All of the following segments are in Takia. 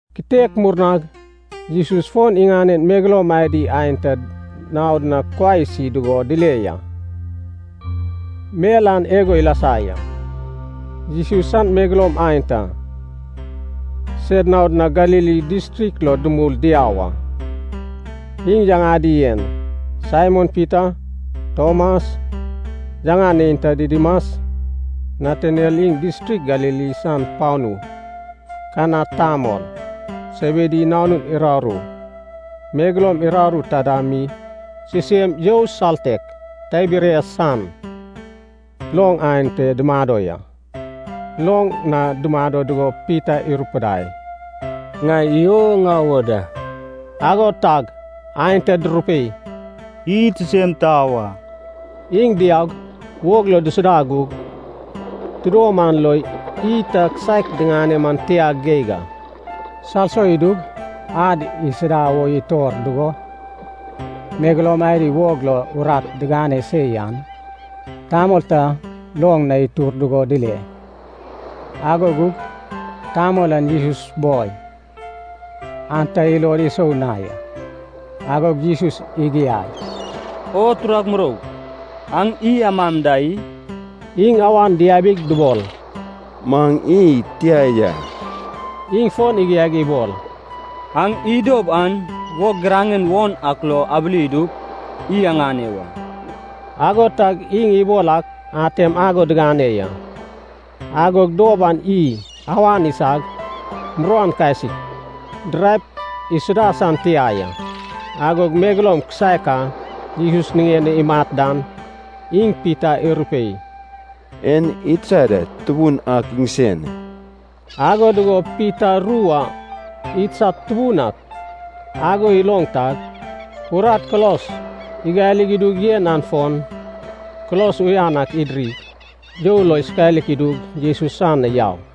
Kitek murnag Jesus fon iŋanen megeloum adi aenta naod na kuai isi dugo dile ya. Mel an igo ilasa ya. Jesus san megeloum aenta, sed naod na Galili distrik lo dumul diau a. Iŋ yaŋadi en: Saimon Pita, Tomas, yaŋan neinta Didimas, Nataniel iŋ distrik Galili san panu Kana tamol, Sebedi nanun uraru, megeloum uraru taida mi sisem you saltek Tiberias san loŋ ante dumado ya. Loŋ na dumado dugo Pita irupidai, “Ŋai iy o ŋau wo da.” Ago tag aenta durupei, “Id sisem tau a.” Iŋ diaug, wog lo dusuda gug, tidom an lo iy ta kisaek diŋane man tia geig a. Salso idug ad isida wo itor dugo, megeloum adi wog lo urat digane se yan, tamol ta loŋ na itur dugo dile. Ago gug tamol an Jesus boi, an ta ilod isou na ya. Agog Jesus igiai, “O turag muroug, aŋ iy amam da i?” Iŋ awan diabig dubol, “Maŋ iy tia ya.” Iŋ fon igiaig ibol, “Aŋ iy dob an wog giraŋen won ak lo abili idup, iy aŋane wa.” Ago tag iŋ ibol ak atem ago digane ya. Agog dob an iy awan isag, muruan kasik, diraep isuda san tia ya. Agog megeloum kisaek a Jesus niŋen o imat dan, iŋ Pita irupei, “An idsad Tubun ak iŋsen.” Ago dugo Pita ru a “idsad Tubun ak” ago iloŋ tag, urat kulos igali idug yen an fon kulos uyan ak idirig, you lo isokalik idug, Jesus san na yau.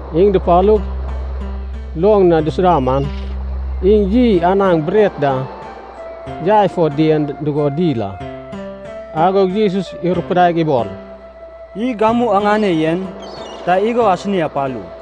Iŋ dupalug, loŋ na dusuda man, iŋ iy anaŋ bret da yai fo dien dugo dil a. Agog Jesus irupudaig ibol, “Iy gamu aŋane yen ta igo asini apalu.”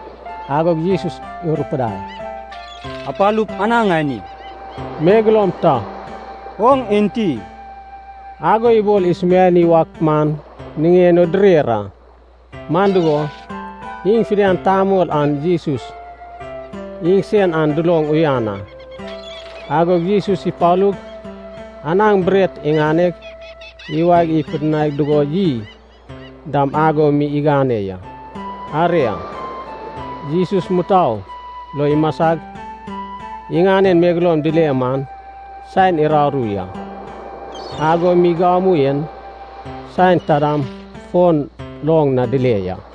Agog Jesus irupudai, “Apalup anaŋ ani.” Megeloum ta “oŋ enti?” ago ibol isumiani wak man niŋen o direr a. Man dugo, iŋ fidian tamol an Jesus iŋsen an duloŋ uyan a. Agog Jesus ipalug, anaŋ bret iŋaneg, iwaeg ipidinai dugo iy dam ago mi igane ya. Aria, Jesus mutou lo imasag iŋanen megeloum dile man saen uraru ya, ago mi gamu en saen taidam fon loŋ na dile ya.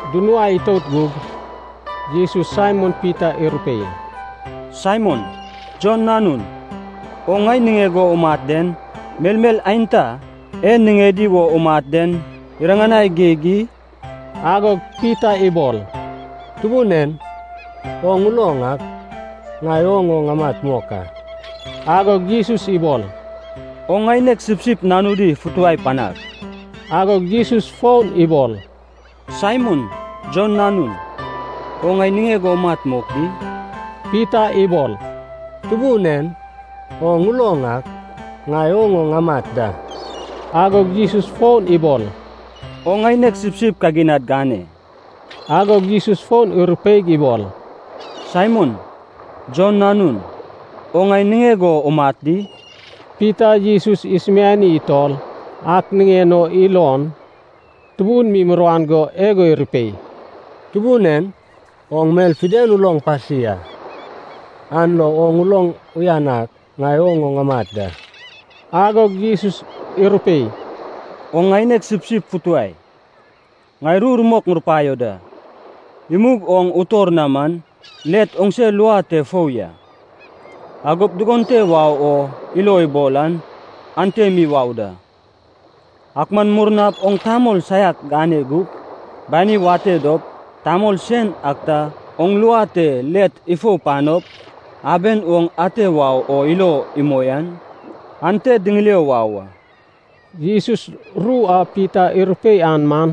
Dunuai itout gug Jesus Saimon Pita irupei, “Saimon, Jon nanun, oŋ ŋai niŋeg o umat den, melmel aenta e niŋedi wo umat den iriŋanai geig i?” Agog Pita ibol, “Tubun en, oŋ uloŋ ak, ŋai oŋ o ŋamat mok a.” Agog Jesus ibol, “Oŋ ŋaineg sipsip nanudi futuwai panag.” Agog Jesus fon ibol, “Saimon, Jon nanun, oŋ ŋai niŋeg o umat mok di?” Pita ibol, “Tubun en, oŋ uloŋ ak, ŋai oŋ o ŋamat da.” Agog Jesus fon ibol, “Oŋ ŋaineg sipsip kaginad gane.” Agog Jesus fon irupeig ibol, “Saimon, Jon nanun, oŋ ŋai niŋeg o umat di?” Pita Jesus isumiani utol ak niŋen o ilon tubun mi muruan go igo irupei, “Tubun en, oŋ mel fidian uloŋ pasi a, an lo oŋ uloŋ uyan ak, ŋai oŋ o ŋamat da.” Agog Jesus irupei, “Oŋ ŋaineg sipsip futuwai. Ŋai ru rumok ŋurupaio da. Imug oŋ utor na man, let oŋse lua te fou ya. Agop dugon te wau o ilo ibol an ante mi wau da. Ak man murnap oŋ tamol saiak gane gup, bani wate dop, tamol sen ak ta oŋ lua te let ifou panop, aben oŋ ate wau o ilo imoi an, ante diŋilio wau a.” Jesus ru a Pita irupei an man,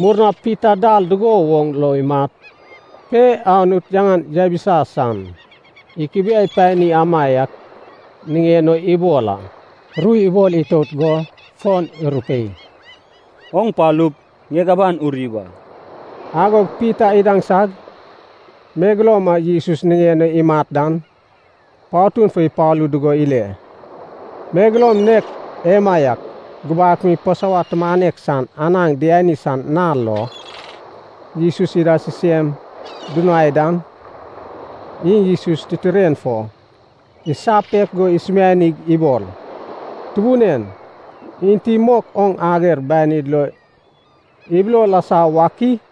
murnap Pita dal dugo woŋ lo imat pe Anut yaŋan yabisa san, ikubiai pani amaiak niŋen o ibol a. Ru ibol itout go fon irupei, “Oŋ palup, ŋieg aban uri wa!” Agog Pita idaŋsag, megeloum a Jesus niŋen o imat dan, patun fo ipalu dugo ile. Megeloum nek emaiak gubak mi Pasova tumanek san anaŋ diani san nal lo, Jesus ida sisem dunuai dan, iŋ Jesus titiren fo isapek go isumianig ibol, “Tubun en, enti mok oŋ ager banid lo ibilo lasa wak i?”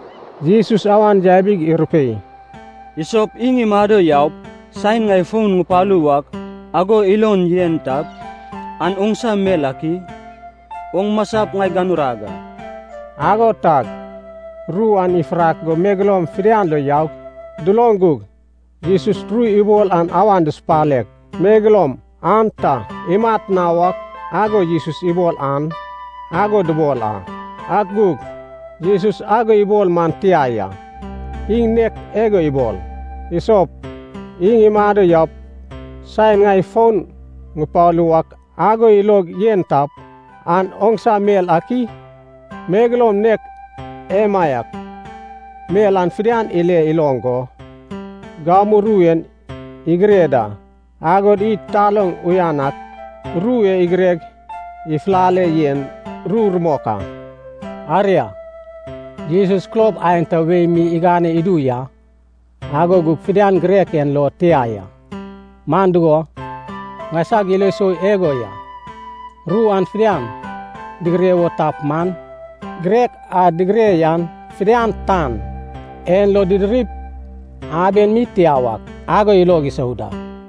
Jesus awan yabig irupei, “Isop iŋ imado yaup saen ŋai fon ŋupalu wak ago ilog yen tap, an oŋsa mel ak i? Oŋ masap ŋai ganurag a!” Ago tag ru an ifurak go megeloum fidian lo yaug, duloŋ gug Jesus ru ibol an awan dusupaleg, “Megeloum an ta imat na wak ago Jesus ibol an,” ago dubol a. Ak gug Jesus ago ibol man tia ya. Iŋ nek igo ibol, “Isop iŋ imado yaup saen ŋai fon ŋupalu wak ago ilog yen tap, an oŋsa mel ak i?” Megeloum nek emaiak mel an fidian ile iloŋ go, gamu ru en igire da. Agod id taloŋ uyan ak ru e igireg ifulale yen ru rumok a. Aria, Jesus kulob aenta wei mi igane idu ya, ago gug fidian girek en lo tia ya. Man dugo, ŋaisag ilo sou igo ya, ru an fidian digire wo tap man, girek a digire yan fidian tan en lo didirip aben mi tia wak ago ilog isou da.